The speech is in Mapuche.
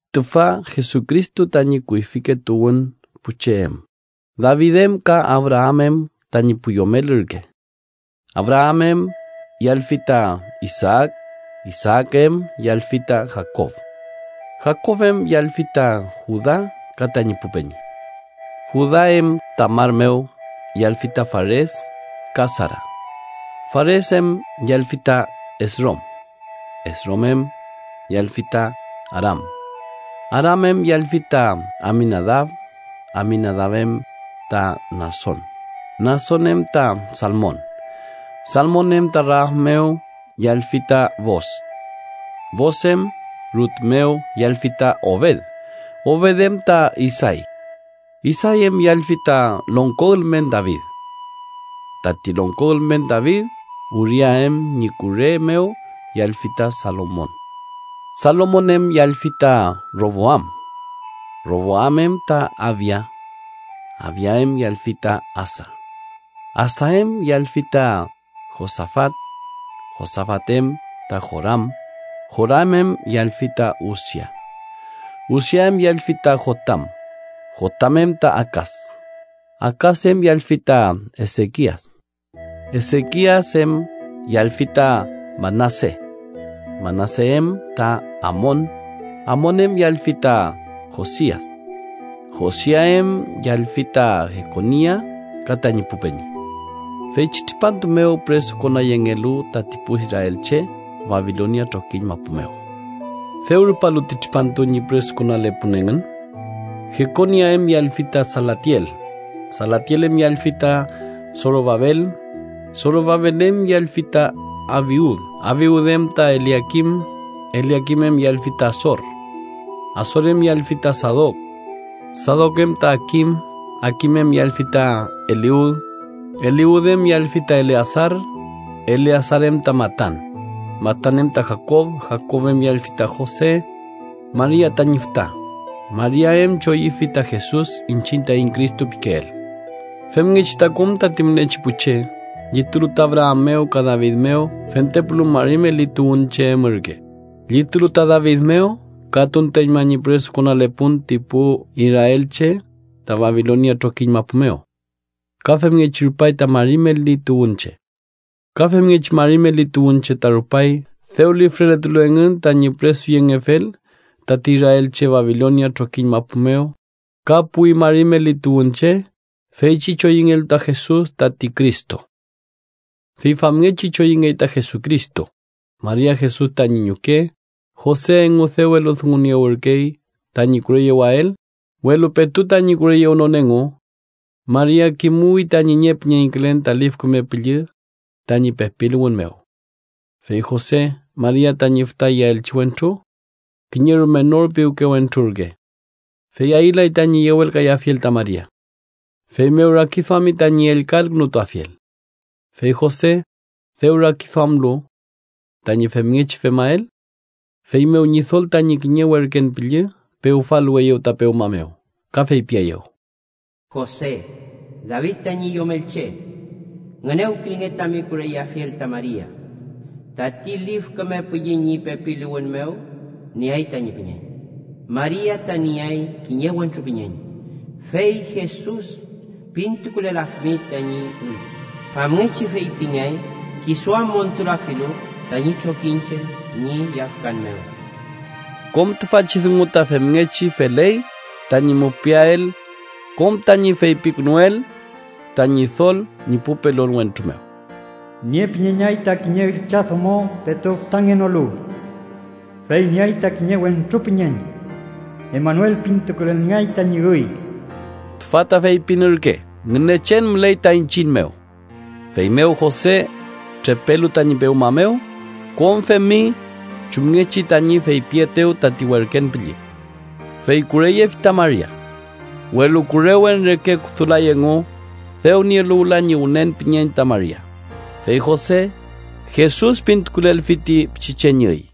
Tüfa Jesucristo tañi kuyfike tuwün pu che em, David em ka Abraam em tañi pu yomel ürke: Abraam em yallfi ta Isaak, Isaak em yallfi ta Jakob. Jakob em yallfi ta Juda ka tañi pu peñi. Juda em Tamar mew yallfi ta Fares ka Sara. Fares em yallfi ta Esrom. Esrom em yallfi ta Aram. Aram em yallfi ta Aminadab, Aminadab em ta Nason, Nason em ta Salmon. Salmon em ta Raab mew yallfi ta Boos, Boos em Rut mew yallfi ta Obed, Obed em ta Isay. Isay em yallfi tati longko ülmen David. Tati longko ülmen David Uria em ñi kure mew yallfi ta Salomon. Salomon em yallfi ta Roboam, Roboam em ta Abia, Abia em yallfi ta Asa. Asa em yallfi ta Josafat, Josafat em ta Joram, Joram em yallfi ta Usia. Usia em yallfi ta Jotam, Jotam em ta Akas, Akas em yallfi ta Esekias. Esekias em yallfi ta Manase, Manase em ta Amon, Amon em yallfi ta Josias. Josia em yallfi ta Jekonia ka tañi pu peñi, feychi tripantu mew püresukonayengelu tati pu israelche Babilonia trokiñ mapu mew. Dew rupalu ti tripantu ñi püresukonalepun engün, Jekonias em yallfi ta Salatiel, Salatiel em yallfi ta Sorobabel. Sorobabel em yallfi ta Abiud, Abiud em ta Eliakim, Eliakim em yallfi ta Asor. Asor em yallfi ta Sadok, Sadok em ta Akim, Akim em yallfi ta Eliud. Eliud em yallfi ta Eleasar, Eleasar em ta Matan, Matan em ta Jakob. Jakob em yallfi ta Jose, Maria tañi füta, Maria em choyüfi ta Jesus iñchiñ taiñ Cristo pikeel. Femngechi ta kom tati mülekechi pu che, llitulu ta Abraam mew ka David mew, fentepulu mari meli tuwünche em ürke: llitulu ta David mew ka tunteñma ñi püresukonalepun ti pu israelche ta Babilonia trokiñ mapu mew ka femngechi rupay ta mari meli tuwünche. Ka femngechi mari meli tuwünche ta rupay dew lifreletulu engün tañi püresuyengefel tati israelche Babilonia trokiñ mapu mew ka puwi mari meli tuwünche feychi choyüngelu ta Jesus tati Cristo. Fey famngechi choyüngey ta Jesucristo: Maria, Jesus tañi ñuke, Jose engu dew eludunguniewürkey tañi kureyewael, welu petu tañi kureyewnon engu, Maria kimuwi tañi niepüñeñkülen tati Lif Küme Püllü tañi pepiluwün mew. Fey Jose, Maria tañi fütayeaelchi wentru kiñe rume nor piwke wentrurke, fey ayülay tañi yewelkayafiel ta Maria, feymew rakiduami tañi ellka elkünutuafiel. Fey Jose dew rakiduamlu tañi femngechi femael, feymew Ñidol tañi kiñe werken püllü pewfaluweyew ta pewma mew, ka feypieyew: “Jose, David tañi yomelche, ngünewkilnge tami kureyeafiel ta Maria, tati Lif Küme Püllü ñi pepiluwün mew nieay tañi püñeñ. Maria ta nieay kiñe wentru püñeñ, fey Jesus pintukulelafimi tañi üy. Famngechi feypingeay kisu am montulafilu tañi trokiñche ñi yafkan mew.” Kom tüfachi dungu ta femngechi feley tañi mupiael kom tañi feypikünuel ta Ñidol ñi pu pelon wentru mew: “Niepüñeñay ta kiñe üllchadomo petu fütangenolu, fey nieay ta kiñe wentru püñeñ. Emanuel pintukulelngeay tañi üy” (tüfa ta feypin ürke: “Ngünechen müley ta iñchiñ mew”). Feymew Jose trepelu tañi pewma mew, kom femi chumngechi tañi feypietew tati werken püllü, fey kureyefi ta Maria. Welu kurewen reke kudulay engu dew nielu wüla ñi wünen püñeñ ta Maria, fey Jose, Jesus pintukulelfi ti pichiche ñi üy.